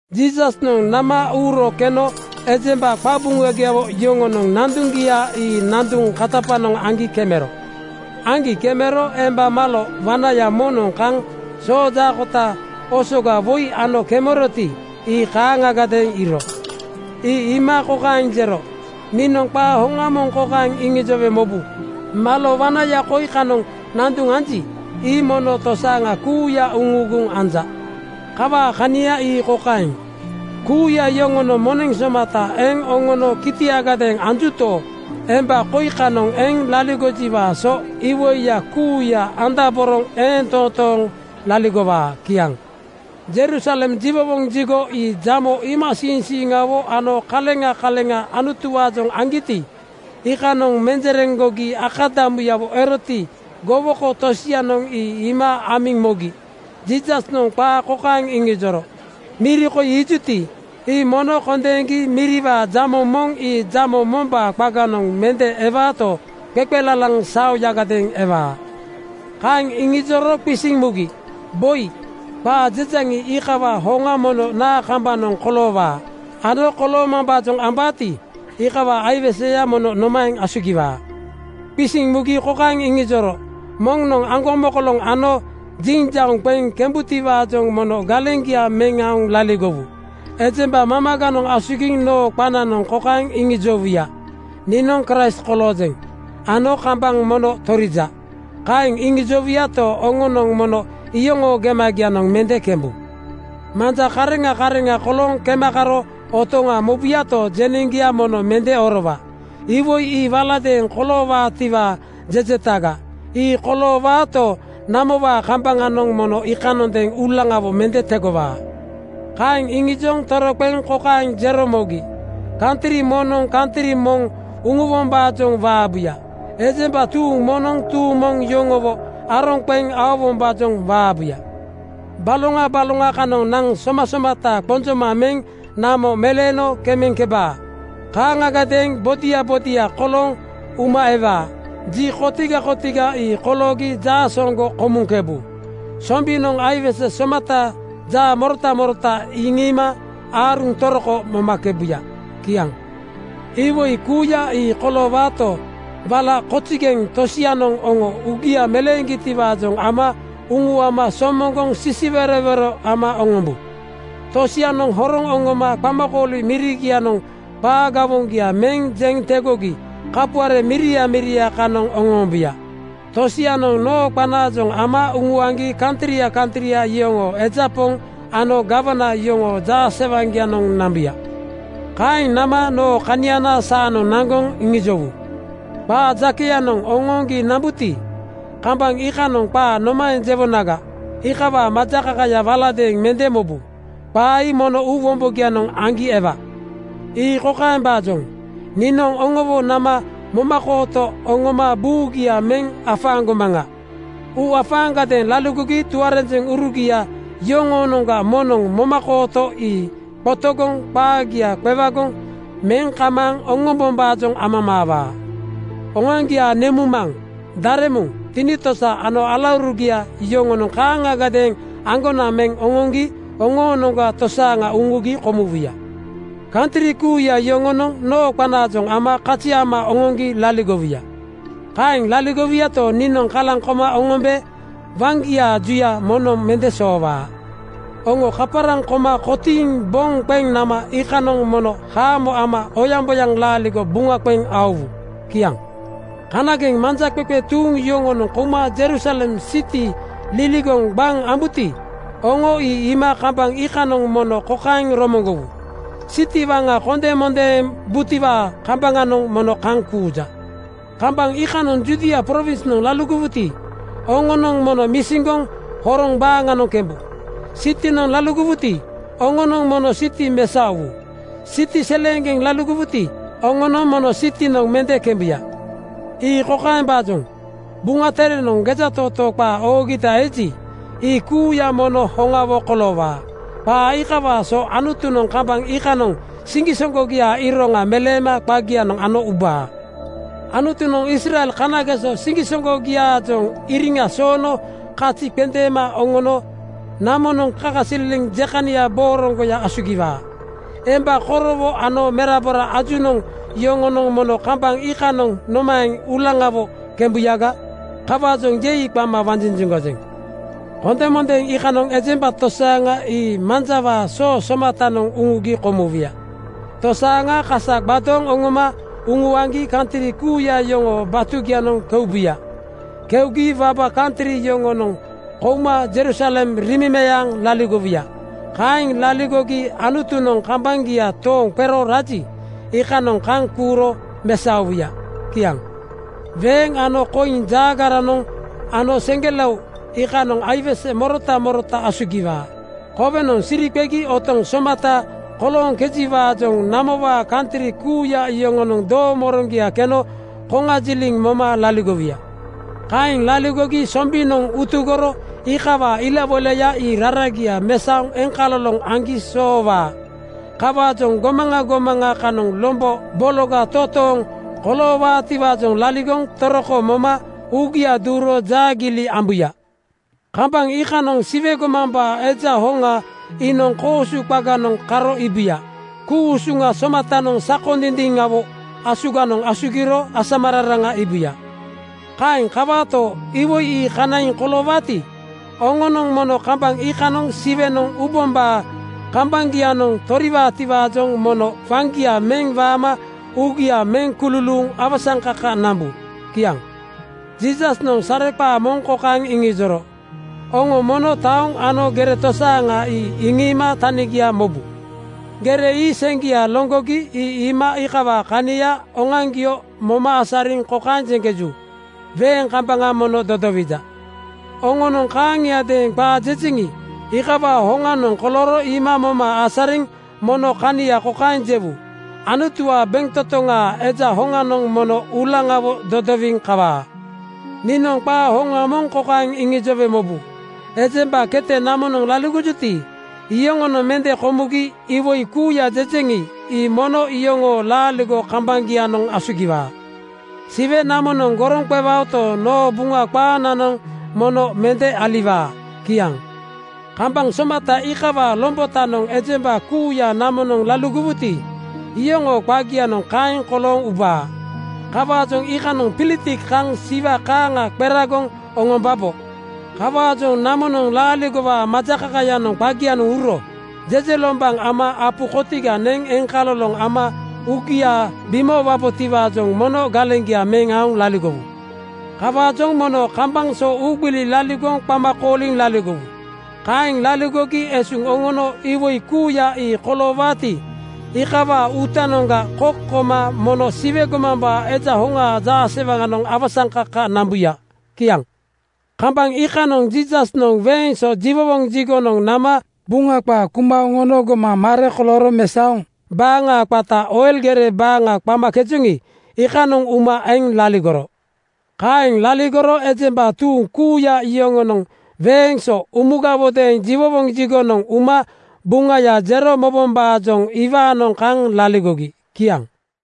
Jiisasnoŋ nama uuro keno ejemba qabuŋagiawo yoŋonoŋ nanduŋgia ii nanduŋ katapanoŋ aŋgi kemero. Aŋgi kemero emba malo wanaya moŋnoŋ kaŋ soojaakota osoga woi ano kemeroti, ii kaaŋagadeeŋ iiro. Ii iima kokaeŋ jero, “Niinoŋ qaa hoŋa moŋ kokaeŋ iŋijowe mobu: Malo wanaya koi kanoŋ nanduŋ anji, ii mono tosaaŋa kuuya uŋuuguŋ anja. Kawaa kania ii kokaeŋ: Kuuya yoŋonoŋ moneŋ somata eŋ oŋono kitiagadeeŋ anjuto, emba koi kanoŋ eŋ laligojiwaa so iwoiya kuuya andaboroŋ eeŋ toontooŋ laligowaa.” Kiaŋ. Jerusalem jiwowoŋ jigo ii jamo iimasiiŋsiiŋawo ano kaleŋa kaleŋa Anutuwaajoŋ aŋgiti, iikanoŋ menjereŋgogi akadamuyawo eroti, gowoko tosianoŋ ii iima amiŋ mogi Jiisasnoŋ qaa kokaeŋ iŋijoro, “Miri koi iijuti, ii mono kondeeŋgi miriwaa jamo moŋ ii jamo mombaa qaganoŋ mende ewaato, qeqelalaŋ saoyagadeeŋ ewaa.” Kaeŋ iŋijoro qisiŋ mugi, “Boi, qaa jejaŋi, iikawaa hoŋa mono naa kambanoŋ koloowaa ano koloomambaajoŋ ambaati, iikawaa aiweseyanoŋ mono nomaeŋ asugiwaa?” Qisiŋ mugi kokaeŋ iŋijoro, “Moŋnoŋ aŋgomokoloŋ ano jiŋjauŋ qeŋ kembutiwaajoŋ mono galeŋgia meŋ aoŋ laligowu. Ejemba mamaganoŋ asugiŋ noo qananoŋ kokaeŋ iŋijowuya, ‘Niinoŋ Kraist koloojeŋ,’ ano, ‘Kambaŋ mono torija.’ Kaeŋ iŋijowuyato, oŋonoŋ mono iyoŋoo gemagianoŋ mende kembu. Manja kareŋa kareŋa kolooŋ kema karo otoŋa mobuyato, jeneŋgia mono mende orowa. Iwoi ii waladeeŋ koloowaatiwaa jejetaga. Ii koloowaato, namowaa kambaŋanoŋ mono iikanondeeŋ uulaŋawo mende tegowaa.” Kaeŋ iŋijoŋ toroqeŋ kokaeŋ jero mogi, “Kantri moŋnoŋ kantri moŋ uŋuwombaajoŋ waabuya. Ejemba tuuŋ moŋnoŋ tuuŋ moŋ yoŋowo aroŋ qeŋ aowombaajoŋ waabuya. Baloŋa baloŋa kanoŋ naŋ somasomata qonjoma meŋ namo meleeno kemeŋkebaa. Kaaŋagadeeŋ bodia bodia kolooŋ uma ewaa. Ji kotiga kotiga ii koloogi jaasooŋgo komuŋkebu. Sombinoŋ aiwese somata jaamorota morota iŋiima aaruŋ toroko momakebuya.” Kiaŋ. “Iwoi kuuya ii koloowaato, wala kozigeŋ tosianoŋ oŋo uugia meleeŋgitiwaajoŋ ama uŋuama somoŋgoŋ sisiwerowero ama oŋombu. Tosianoŋ horoŋ oŋoma qamakooli mirigianoŋ qaa gawoŋgia meŋ jeŋ tegogi kapuare miria miria kanoŋ oŋoombuya. Tosianoŋ noo qanaajoŋ ama uŋuaŋgi kantria kantria yoŋoo eja poŋ ano gawana yoŋoo jaasewaŋgianoŋ nambuya. Kaeŋ nama noo kaniana saanoŋ naŋgoŋ iŋijowu. Qaa jakeyanoŋ oŋooŋgi nambuti, kambaŋ iikanoŋ qaa nomaeŋ jewonaga, iikawaa majakakaya waladeeŋ mende mobu. Qaa ii mono uu wombogianoŋ aŋgi ewa. “Ii kokaembaajoŋ: Niinoŋ oŋowo nama momakooto oŋoma buugia meŋ afaaŋgomaŋa. Uuafaaŋgadeeŋ laligogi tuarenjeŋurugia yoŋoonoŋga moŋnoŋ momakooto ii qotogoŋ qaagia qewagoŋ meŋ kamaaŋ oŋombombaajoŋ amamaawaa. Oŋoaŋgiaa nemuŋmaŋ, daremuŋ, tinitosa ano alaurugia yoŋonoŋ kaaŋagadeeŋ aŋgonaŋ meŋ oŋoŋgi oŋoonoŋga tosaaŋa uŋugi komuwuya. Kantri kuuya yoŋonoŋ noo qanaajoŋ ama kazi ama oŋoŋgi laligowuya. “Kaeŋ laligowuyato, niinoŋ kalaŋ koma oŋombe waŋgiaa juya moŋnoŋ mende soowaa. Oŋo kaparaŋ koma kotiiŋ boŋ qeŋ nama iikanoŋ mono haamo ama oyaŋboyaŋ laaligo buŋa qeŋ aowuya.” Kiaŋ. “Kanageŋ manjaqeqe tuuŋ yoŋonoŋ kouma Jerusalem siti liligoŋ gbaŋ ambuti, oŋo ii iima kambaŋ iikanoŋ mono kokaeŋ romoŋgowu, ‘Siti waŋa kondemondeembutiwaa kambaŋanoŋ mono kaŋ kuuja.’ Kambaŋ iikanoŋ Judia prowinsnoŋ laligowuti, oŋonoŋ mono misiŋgoŋ horoŋ baaŋanoŋ kembu. Sitinoŋ laligowuti, oŋonoŋ mono siti mesaowu. Siti seleeŋgeŋanoŋ laligowuti, oŋonoŋ mono sitinoŋ mende kembuya. “Ii kokaembaajoŋ: Buŋa Terenoŋ gejatootoo qaa oogita eji, ii kuuya mono hoŋawo koloowaa. Qaa iikawaa so Anutunoŋ kambaŋ iikanoŋ siŋgisoŋgogiaa iroŋa meleema qagianoŋ ano ubaa. Anutunoŋ Israel kanageso siŋgisoŋgogiaajoŋ iriŋa soono kazia qendeema oŋono namonoŋ kakasililiŋ jekania booroŋgoya asugiwaa. Emba korowo ano merabora ajunoŋ yoŋonoŋ mono kambaŋ iikanoŋ nomaeŋ uulaŋawo kembuyaga? Kawaajoŋ ‘Yei!’ qama wanjinjiŋgojeŋ. “Kondeŋmondeeŋ iikanoŋ ejemba tosaaŋa ii manjawaa soo somatanoŋ uŋugi komuwuya. Tosaaŋa kasa gbadooŋ oŋoma uŋuaŋgi kantri kuuya yoŋoo batugianoŋ keubuya. Keugi waba kantri yoŋonoŋ kouma Jerusalem riimemeaaŋ laligowuya. Kaeŋ laligogi Anutunoŋ kambaŋgia tooŋ qero raji, iikanoŋ kaŋ kuuro mesaowuya.” Kiaŋ. “Weeŋ ano koiŋ jaagaranoŋ ano seŋgelao iikanoŋ aiwese morota morota asugiwaa. Kowenoŋ siri qegi otoŋ somata kolooŋkejiwaajoŋ namowaa kantri kuuya yoŋonoŋ doomoroŋgia keno koŋajiliŋ moma laligowuya. Kaeŋ laligogi sombinoŋ utugoro iikawaa ilawoilaya ii raragia mesaoŋ eŋkaloloŋ aŋgi soowaa. Kawaajoŋ gomaŋa gomaŋa kanoŋ lombo bologa totooŋ koloowaatiwaajoŋ laligoŋ toroko moma uugia duuro jaagiili ambuya. “Kambaŋ iikanoŋ Siwe gomambaa Eja hoŋa iinoŋ koosu qaganoŋ karo iibuya. Ku-usuŋa somatanoŋ sakondindiŋawo asuganoŋ asugiro asamararaŋa iibuya. Kaeŋ kawaato, iwoi ii kanaiŋ koloowaati, oŋonoŋ mono kambaŋ iikanoŋ Siwenoŋ ubombaa kambaŋgianoŋ toriwaatiwaajoŋ mono waŋgia meŋ waama uugia meŋ kululuuŋ awasaŋkaka nambu.” Kiaŋ. Jiisasnoŋ sareqaa moŋ kokaeŋ iŋijoro, “Oŋo mono taoŋ ano gere tosaaŋa ii iŋiima tanigia mobu. Gere ii seŋgia loŋgogi ii iima iikawaa kania oŋoaŋgio moma asariŋ kokaeŋ jeŋkeju, ‘Weeŋ kambaŋa mono dodowija.’ Oŋonoŋ kaaŋiadeeŋ qaa jejeŋi, iikawaa hoŋanoŋ kolooro iima moma asariŋ mono kania kokaeŋ jewu, ‘Anutuwaa bentotoŋaa Eja hoŋanoŋ mono uulaŋawo dodowiŋ kawaa.’ “Niinoŋ qaa hoŋa moŋ kokaeŋ iŋijowe mobu: Ejemba kete namonoŋ laligojuti, iyoŋonoŋ mende komugi iwoi kuuya jejeŋi, ii mono iyoŋoo laaligo kambaŋgianoŋ asugiwaa. Siwe namonoŋ goroŋ qewaoto, noo Buŋa qaananoŋ mono mende aliwaa.” Kiaŋ. “Kambaŋ somata iikawaa lombotanoŋ ejemba kuuya namonoŋ laligowuti, iyoŋoo qagianoŋ kaeŋ kolooŋ ubaa. Kawaajoŋ iikanoŋ pilitik kaŋ siwa kaaŋa qeragoŋ oŋombabo. Kawaajoŋ namonoŋ laaligowaa majakakayanoŋ qagianoŋ uro jejelombaŋ ama apu kotiga neŋ eŋkaloloŋ ama uugia bimoowabotiwaajoŋ mono galeŋgia meŋ aoŋ laligowu. “Kawaajoŋ mono kambaŋ so uugbili laligoŋ qama kooliŋ laligowu. Kaeŋ laligogi esuŋ oŋono iwoi kuuya ii koloowaati, iikawaa uutanoŋga kok koma mono Siwe gomambaa Eja hoŋaa jaasewaŋanoŋ awasaŋkaka nambuya.” Kiaŋ. Kambaŋ iikanoŋ Jiisasnoŋ weeŋ so jiwowoŋ jigonoŋ nama Buŋa qaa kuma oŋono gomaŋ mare kolooro mesaoŋ baaŋa qata Oil gere baaŋa qamakejoŋi, iikanoŋ uma eŋ laligoro. Kaeŋ laligoro ejemba tuuŋ kuuya yoŋonoŋ weeŋ so umugawodeeŋ jiwowoŋ jigonoŋ uma Buŋaya jero mobombaajoŋ iwaanoŋ kaŋ laligogi. Kiaŋ.